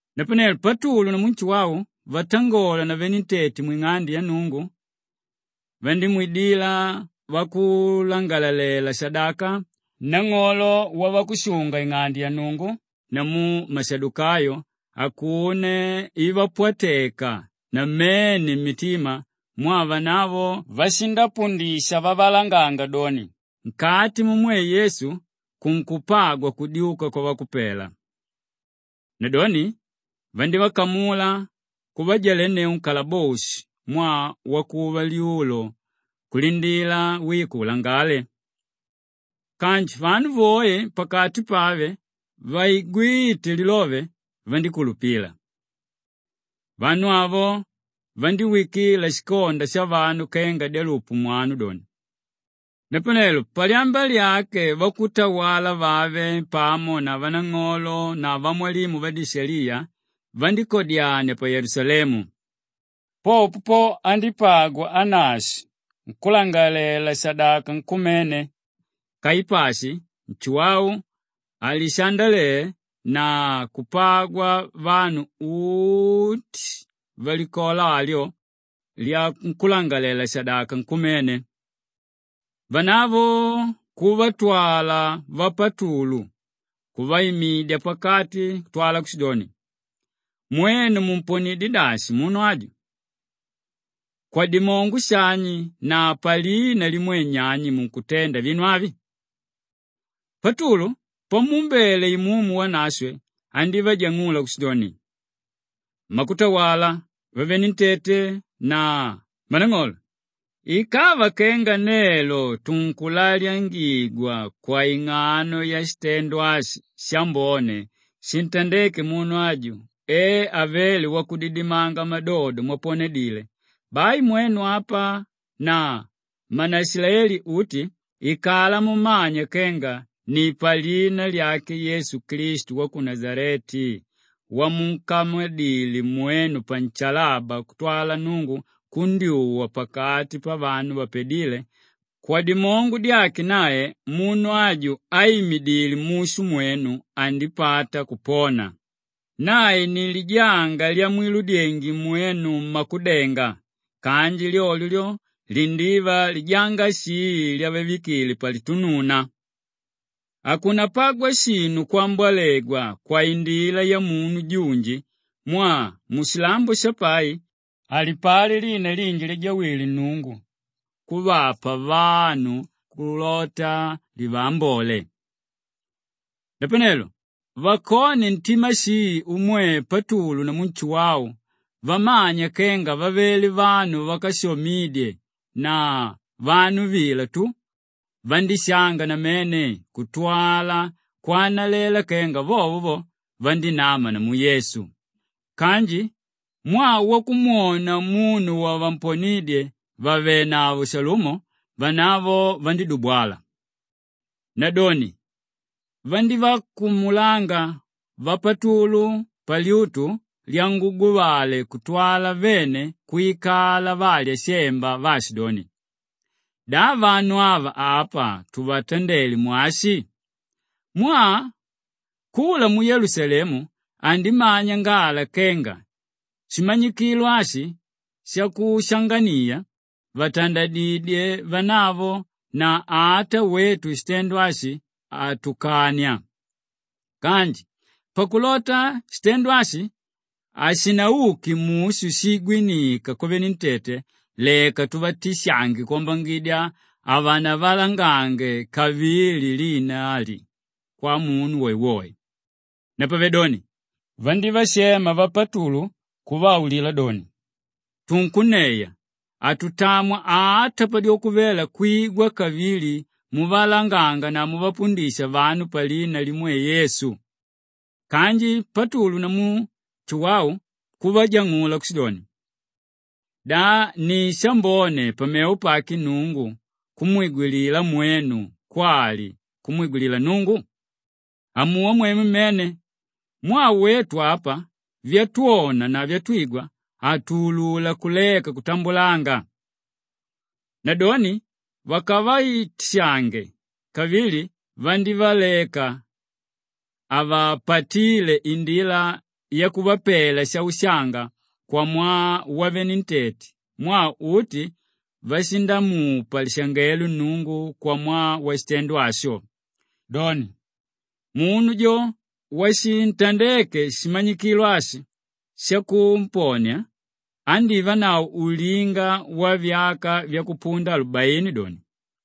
Napanelo Patulu namu Nshuwau vatangola na venentete mwing'ande ya Nnungu, vandívaidila vakulangalalela-shadaka, nang'olo wavakushunga-ing'ande ya Nnungu namu mashadukayo akuno ivapwateka namene mmitima mwaa vanavo vashindapundisha vavalanganga doni, nkati mumwe Yesu kunkupagwa kudyuka kwavakupela. Nadoni vandívakamula kuvajalenneu nkalaboshi mwaa wakuva lyulo kulindila wiko ulangale. Kanji vanu voe pakati pave vaigwíte lilove, vandíkulupila. Vanu avo vandíwikila shikonda shavalume kenga dyalupu mwanu doni. Napanelo palyamba lyake vakutawala vave pamo na vanang'olo na vamwalimu vadishaliya vandíkadyania pa Yelusalemu. Popo po, andípagwa Anashi nkúlangalalela-shadaka nkumene, Kaipashi, Nshuwau, Alishandele na kupagwa vanu uti valikola alyo lyankúlangalalela-shadaka nkumene. Vanavo kuvatwala vapatulu kuvaimidya pakati kutwala kushidoni, “Mwenu mumponidyé dashi munu aju? Kwadimongo shani na palina limwe nyani munkutenda vinu avi?” Patulu pamuumbele Imumu Wanashwe andívajang'ula kushidoni, “Mmakutawala vavenentete na mmanang'olo! Ikava kenga nelo tunkulalyangigwa kwaing'ano yashitendo ashi shambone shintandéke munu aju e avéle wakudidimanga madodo mwaponedile, bai mwenu apa na mmanaishilaeli uti ikala mumanya kenga ni palina lyake Yesu Klistu wa ku Nashaleti wamunkamadile mwenu panshalaba kutwala Nnungu kundyuwa pakati pavanu vapadíle, kwadimongo dyake nae munu aju áimidile mushu mwenu andípata kupona. Nae ni, “ ‘lijanga lyamwiludyenge mwenu mmakudenga kanji lyolyo lyo, lindiva lijanga shii lyavavikile palitununa.’ Hakunapagwa shinu kwambolegwa kwaindila yamunu junji mwaa mushilambo shapai, halipali lina linji lyajawile Nnungu kuvapa vanu kulota livaambole.” Napanelo vakone ntima shii umwe Patulu namu Nshuwau vamanya kenga vavele vanu vákashamidye na vanu vila tu, vandíshanga namene kutwala kwanalela kenga vovo vo, vandinama namu Yesu. Kanji mwaa wakumwona munu wavamponidye vàvenavo shalumo, vanavo vandídubwala. Nadoni vandívakumulanga vapatulu palyutu lyanguguvale kutwala vene kwikala valya shemba vaashidoni, “Da vanu ava apa tuvatandele mwashi? Mwaa kula muyelusalemu andimanya ngala kenga shimanyikilo ashi shakushanganiya, vatandadidyé vanavo na ata wetu shitendo ashi hatukania. Kanji pakulota shitendo ashi hashinauke mushu shiigwinika kwavenentete leka tuvatishange kwambangidya havanavalangange kavili lina ali kwamunu woewoe.” Napavedoni vandívashema vapatulu kuvaulila doni, “Tunkunneya, hatutamwa ata padyoko vela kumwigwa kavili muvalanganga na muvapundisha vanu palina limwe Yesu.” Kanji Patulu namu Nshuwau kuvajang'ula kushidoni, “Da ni shambone pamevo pake Nnungu kumwigwilila mwenu kwali kumwigwilila Nnungu? Amuwa mwemwe mmene! Mwaa wetu apa, vyatwona na vyatwigwa hatuulula kuleka kutambulanga.” Nadoni vakavatishange kavili vandívaleka, havapatíle indila yakuvapela shaushanga kwamwaa wavenentete mwaa uti vashindamupa lishangelo Nnungu kwamwaa washitendo asho. Doni, munu jo washintandeke shimanyikilo ashi shakuponia, andívanavo ulinga wavyaka vyakupunda alubaini doni.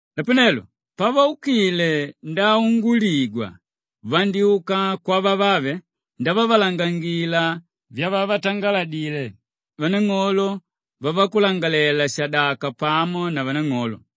Napanelo pavaukile ndaunguligwa, vandyúka kwavavave ndavavalangangila vyavavatangaladile vanang'olo vavakulangalalela-shadaka pamo na vanang'olo.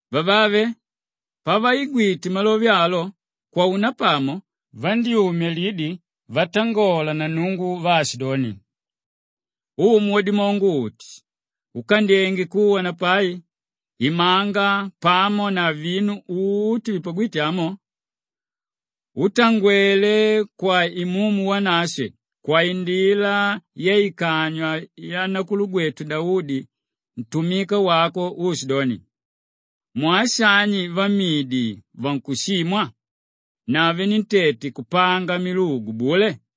Vavave pavaigwite malove alo, kwaunapamo vandyúmya lidi vatangola na Nnungu vaashidoni, “Umu Wadimongo-uti úkandyenge kuwa na pai, imanga pamo na vinu uti vipagwíte amo útangwele kwa Imumu Wanashwe kwaindila yaikanywa yanakulugwetu Daudi ntumika wako uushidoni, “ ‘Mwaa shani vamidi vankushimwa na venentete kupanga milugu bule?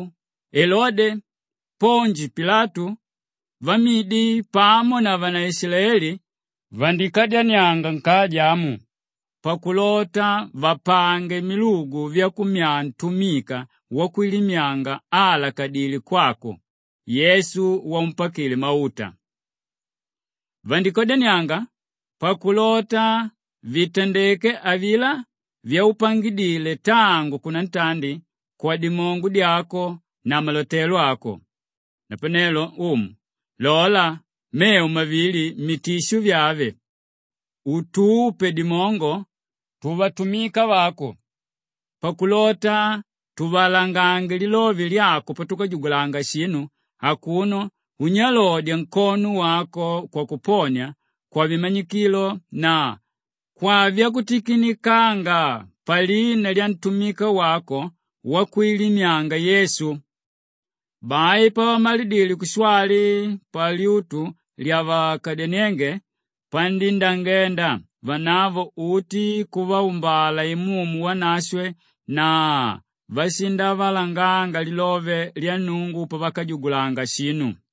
Namwiu, Elode, Ponji Pilatu, vamidi pamo na vanaishilaeli vandíkadyanianga nkaja amu pakulota vapange milugu vyakummyaa ntumika wakwilimyanga áalakadile kwako, Yesu waumpakile mauta. Vandíkadyanianga pakulota vitandeke avilá vyaupangidile tangu kunantandi kwadimongo dyako na malotelo ako. Napanelo Umu, lola mevo mavili mitisho vyave utupe dimongo tuvatumika vako pakulota tuvalangange lilove lyako patukajugulanga shinu akuno unyalodya nkono wako kwakuponia, kwavimanyikilo na kwavyakutikinikanga palina lyantumika wako wakwilimyanga, Yesu.” Bai pavamalidile kushwali, palyutu lyavakadyaniénge pandíndangenda, vanavo uti kuvaumbala Imumu Wanashwe na vashindavalanganga lilove lya Nnungu pavakajugulanga shinu.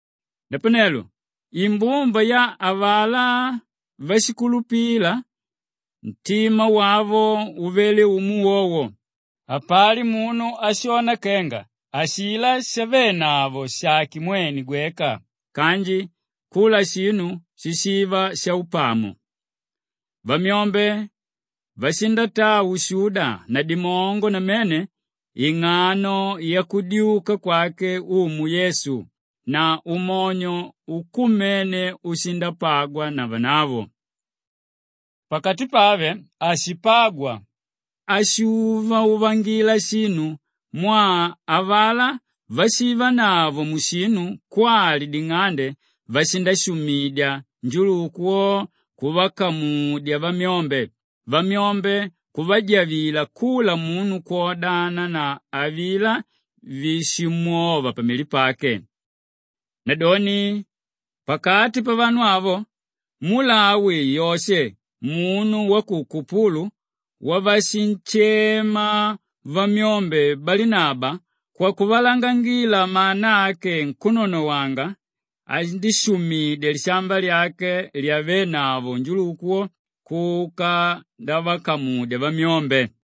Napanelo imbumba ya avalá váshikulupila, ntima wavo uvele umo wowo; hapali munu ashona kenga ashilá shavenavo shàke mwene gweka kanji kula shinu shishiva shaupamo. Vamyombe vashindataa ushuda na dimongo namene ing'ano yakudyuka kwake Umu Yesu na umonyo ukumene ushindapagwa na vanavo. Pakati pave hashipagwa áshuuvauvangila shinu mwaa avalá vashivanavo mushinu kwali ding'ande vashindashumidya, njuluku wo kuvakamudya vamyombe, vamyombe kunjavila kula munu kwodana na avilá víshimwova pamili pake. Nadoni pakati pavanu avo, mulawi Yoshe munu wa ku Kupulu wavashinshema vamyombe Balinaba kwakuvalangangila mana ake nkúnonowanga, andíshumidya lishamba lyake lyavenavo njuluku wo, kuka ndavakamudya vamyombe.